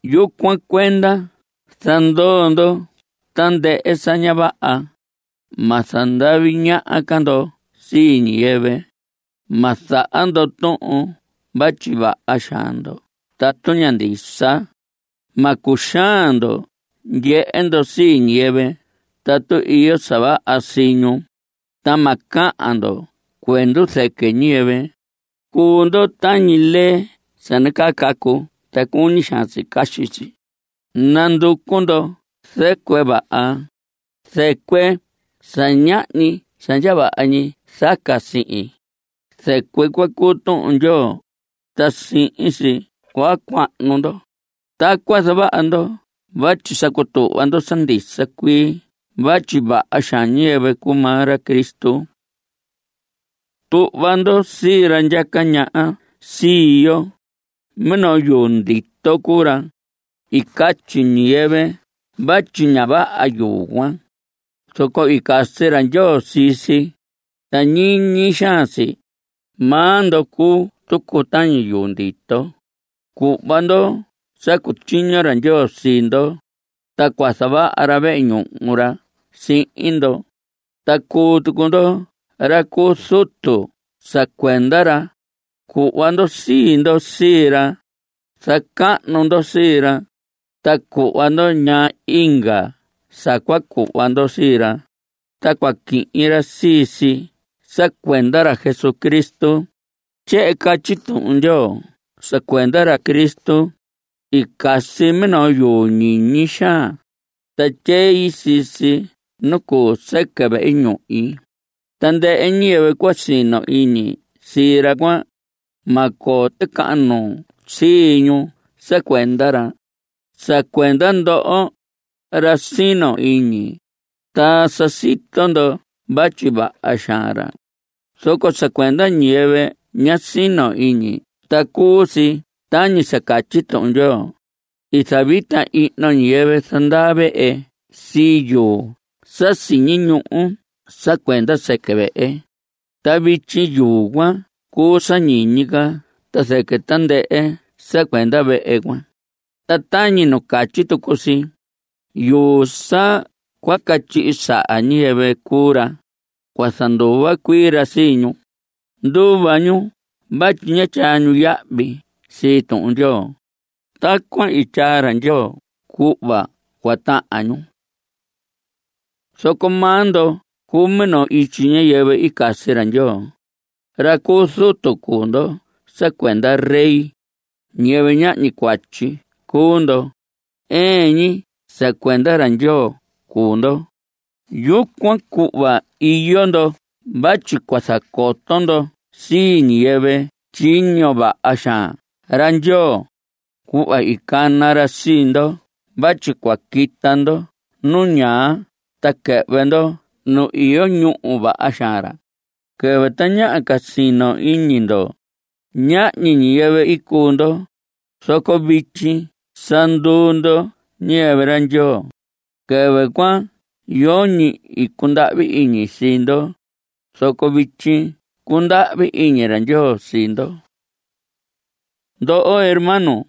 Yucuan cuenda zandoo ndo tandɨhɨ sa ña vaha. Ma zandavi ñaha ca ndo sii ñiyɨvɨ. Ma zaha ndo tuhun vatyi vaha xaan ndo tatu ña ndisa. Ma cuxaan ndo ndyehe ndo sii ñiyɨvɨ tatu iyo sa vaha sii ñu, ta ma cahan ndo cuendu zɨquɨ ñiyɨvɨ. Cuu ndo tañi lee sa nacaa cacu ta cuñi xaan si caxi si. Nanducu ndo zɨcuɨ vaha, zɨcuɨ sa ñahñi sa ndya vaha ñi zaca sihin. Zɨcuɨ cuan cuu Tuhun Ndyoo, ta sihin si cua cuahnu ndo. Tacuan zavaha ndo vatyi sa cutuhva ndo sa ndisa cuii vatyi vaha xaan ñiyɨvɨ cuu maa ra Cristo. Tuhva ndo sii ra ndyaca ñaha sii yo. Minoo yuu ndito cuu ra. I catyi ñiyɨvɨ vatyi ña vaha yuu cuan, zoco i casi ra Ndyoo sii si, ta ñiñi xaan si. Maa ndo cuu tucu tañi yuu ndito. Cuhva ndo sa cutyiño ra Ndyoo sii ndo, ta cua zavaha ra vehe ñuhu ra sihin ndo. Ta cuu tucu ndo ra cu zutu sa cuenda ra. Cuhva ndo sii ndo sii ra, zacahnu ndo sii ra, ta cuhva ndo ñaa inga sa cua cuhva ndo sii ra, ta cua quihin ra sii si sa cuenda ra Jesucristo. Tyehen catyi Tuhun Ndyoo sa cuenda ra Cristo: I casi minoo yuu ñiñi xaan, ta tyei sii si nu cuu sɨquɨ vehe ñuhi. Tandɨhɨ ñiyɨvɨ cua sino iñi sii ra cuan, ma coo ticahan nuu sii ñu sa cuenda ra. Sa cuenda ndoho, ra sino iñi, ta sa sito ndo vatyi vaha xaan ra, zoco sa cuenda ñiyɨvɨ ña sino iñi ta cuu si tañi catyi Tuhun Ndyoo: I zavita ihno ñiyɨvɨ zandaa vehe sii yuu sa siñi ñuhu sa cuenda sɨquɨ vehe. Ta vityi yuu cuan cuu sa ñiñi ca ta zɨquɨ tandɨhɨ sa cuenda vehe cuan. Ta tañi nu catyi tucu si: Yuu sa cua catyihi saha ñiyɨvɨ cuu ra. Cua zanduva cuii ra sii ñu. Nduva ñu vatyi ña tyaa ñu yahvi sii Tuhun Ndyoo. Tacuan i tyaa ra Ndyoo cuhva cua tahan ñu. Zoco maa ndo cuu minoo ityi ñiyɨvɨ i casi ra Ndyoo. Ra cu zutu cuu ndo sa cuenda rey. Ñiyɨvɨ ñahñi cuatyi cuu ndo; ɨɨn ñi sa cuenda ra Ndyoo cuu ndo. Yucuan cuhva iyo ndo vatyi cua zacoto ndo sii ñiyɨvɨ tyiño vaha xaan ra Ndyoo, cuhva i cana ra sii ndo vatyi cua quita ndo nu ñaa ta quɨhvɨ ndo nu iyo ñúhu vaha xaan ra. Quɨvɨ tañaha ca sino iñi ndo, ñahñi ñiyɨvɨ i cuu ndo, zoco vityi sa nduu ndo ñiyɨvɨ ra Ndyoo. Quɨvɨ cuan yoñi i cundahvi iñi sii ndo, zoco vityi cundahvi iñi ra Ndyoo sii ndo. Ndoho hermanos,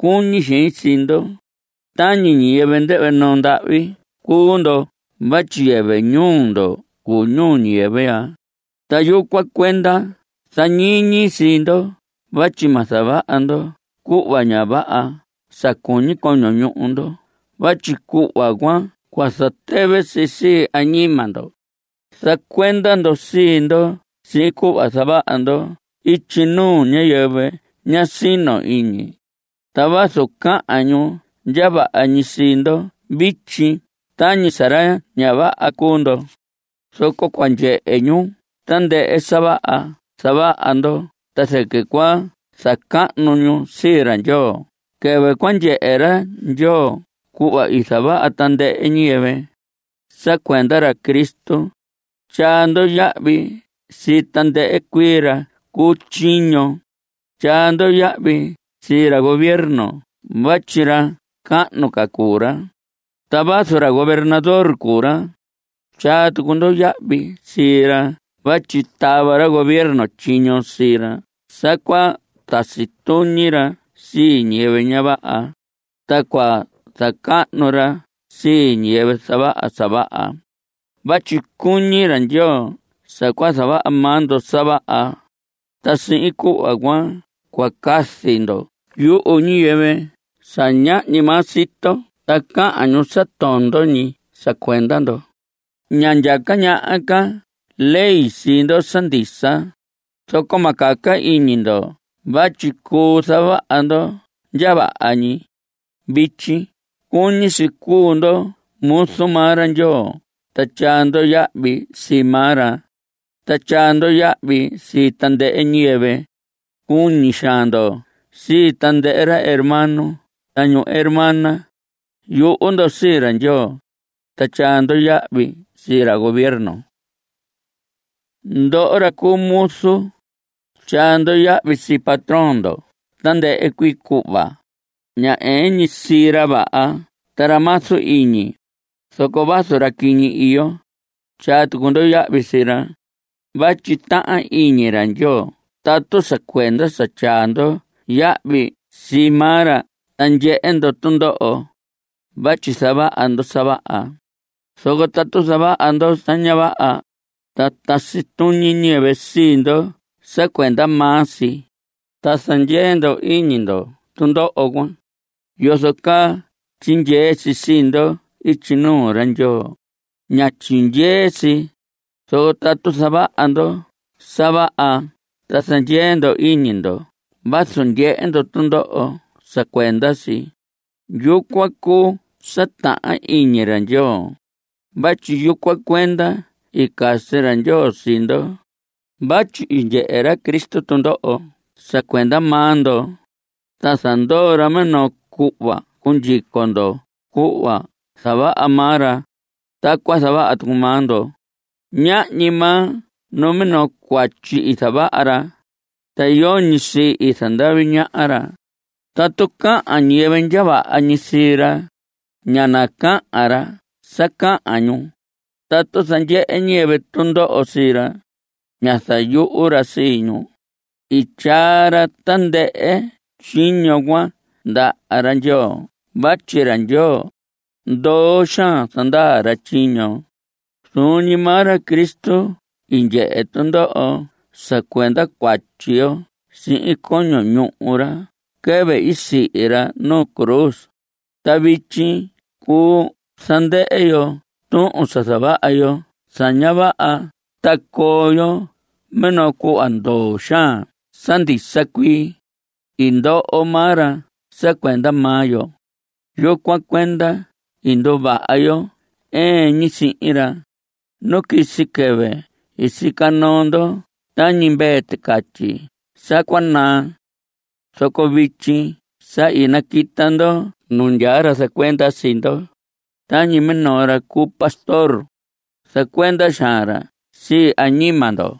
cuñi xein sii ndo. Tañi ñiyɨvɨ ndɨhvɨ noo ndahvi cuu ndo vatyi yɨvɨ ñuu ndo cuu ñuu ñiyɨvɨ ya, ta yucuan cuenda zañiñi sii ndo vatyi ma zavaha ndo cuhva ña vaha sa cuñi coño ñuhu ndo vatyi cuhva cuan cua zatɨvɨ si sii añima ndo. Zacuenda ndo sii ndo sihin cuhva zavaha ndo ityi nuu ñiyɨvɨ ña sino iñi. Ta vazu cahan ñu ndya vaha ñi sii ndo vityi tañi sa ra ña vaha cuu ndo, zoco cua ndyehe ñu tandɨhɨ sa vaha zavaha ndo ta zɨquɨ cua zacahnu ñu sii ra Ndyoo quɨvɨ cua ndyehe ra Ndyoo cuhva i zavaha tandɨhɨ ñiyɨvɨ. Sa cuenda ra Cristo, tyaa ndo yahvi sii tandɨhɨ cuii ra cu tyiño. Tyaa ndo yahvi sii ra gobierno vatyi ra cahnu ca cuu ra. Ta vazu ra gobernador cuu ra, tyaa tucu ndo yahvi sii ra vatyi tava ra gobierno tyiño sii ra sa cua tasi tuñi ra sii ñiyɨvɨ ña vaha, ta cua zacahnu ra sii ñiyɨvɨ zavaha sa vaha. Vatyi cuñi ra Ndyoo sa cua zavaha maa ndo sa vaha, ta sihin cuhva cuan cua cazi ndo yuhu ñiyɨvɨ sa ñahñi maa sito ta cahan ñu sa tondo ñi sa cuenda ndo. Ña ndyaca ñaha ca ley sii ndo sa ndisa, zoco ma caca iñi ndo vatyi cuu zavaha ndo ndya vaha ñi. Vityi cuñi si cuu ndo muzu maa ra Ndyoo ta tyaa ndo yahvi sii maa ra. Ta tyaa ndo yahvi sii tandɨhɨ ñiyɨvɨ. Cuñi xaan ndo sii tandɨhɨ ra hermano ta ñu hermana. Yuhu ndo sii ra Ndyoo. Ta tyaa ndo yahvi sii ra gobierno. Ndoho ra cu muzu, tyaa ndo yahvi sii patrón ndo tandɨhɨ cuii cuhva. Ña ɨɨn ñi sii ra vaha ta ra mazu iñi, zoco vazu ra quiñi iyo, tyaa tucu ndo yahvi sii ra. Vatyi tahan iñi ra Ndyoo tatu sa cuenda sa tyaa ndo yahvi sii maa ra ta ndyehe ndo tundoho, vatyi zavaha ndo sa vaha. Zoco tatu zavaha ndo sa ña vaha, ta tasi tuñi ñiyɨvɨ sii ndo sa cuenda maa si, ta zandyee ndo iñi ndo tundoho cuan, ¿yozo caa tyindyee si sii ndo ityi nuu ra Ndyoo? Ña tyindyee si. Zoco tatu zavaha ndo sa vaha ta zandyee ndo iñi ndo vazu ndyehe ndo tundoho sa cuenda si, yucuan cuu sa tahan iñi ra Ndyoo. Vatyi yucuan cuenda i casi ra Ndyoo sii ndo. Vatyi i ndyehe ra Cristo tundoho sa cuenda maa ndo, ta zandoo ra minoo cuhva cua cundyico ndo. Cuhva zavaha maa ra, tacuan zavaha tucu maa ndo. Ñahñi maa numinoo cuatyi i zavaha ra. Ta yoñi sii i zandavi ñaha ra. Tatu cahan ñiyɨvɨ ndya vaha ñi sii ra, ñá nacahan ra sa cahan ñu. Tatu zandyehe ñiyɨvɨ tundoho sii ra, ñá zayuhu ra sii ñu. I tyaa ra tandɨhɨ tyiño cuan ndaha ra Ndyoo vatyi ra Ndyoo, ndoo xaan zandaa ra tyiño. Zuun ñi maa ra Cristo i ndyehe tundoho sa cuenda cuatyi yo sihin coño ñuhu ra quɨvɨ i sihi ra nu cruz. Ta vityi cuu zandɨhɨ yo tuhun sa zavaha yo sa ña vaha ta coo yo minoo cuhva ndoo xaan sa ndisa cuii. I ndoho maa ra sa cuenda maa yo, to yucuan cuenda i nduvaha yo ɨɨn ñi sihin ra. Nu quisi quɨvɨ i sica noo ndo tañi mvee ticatyi sa cua naa, zoco vityi sa naquita ndo nu ndyaa ra zacuenda sii ndo. Tañi minoo ra cu pastor, zacuenda xaan ra sii añima ndo.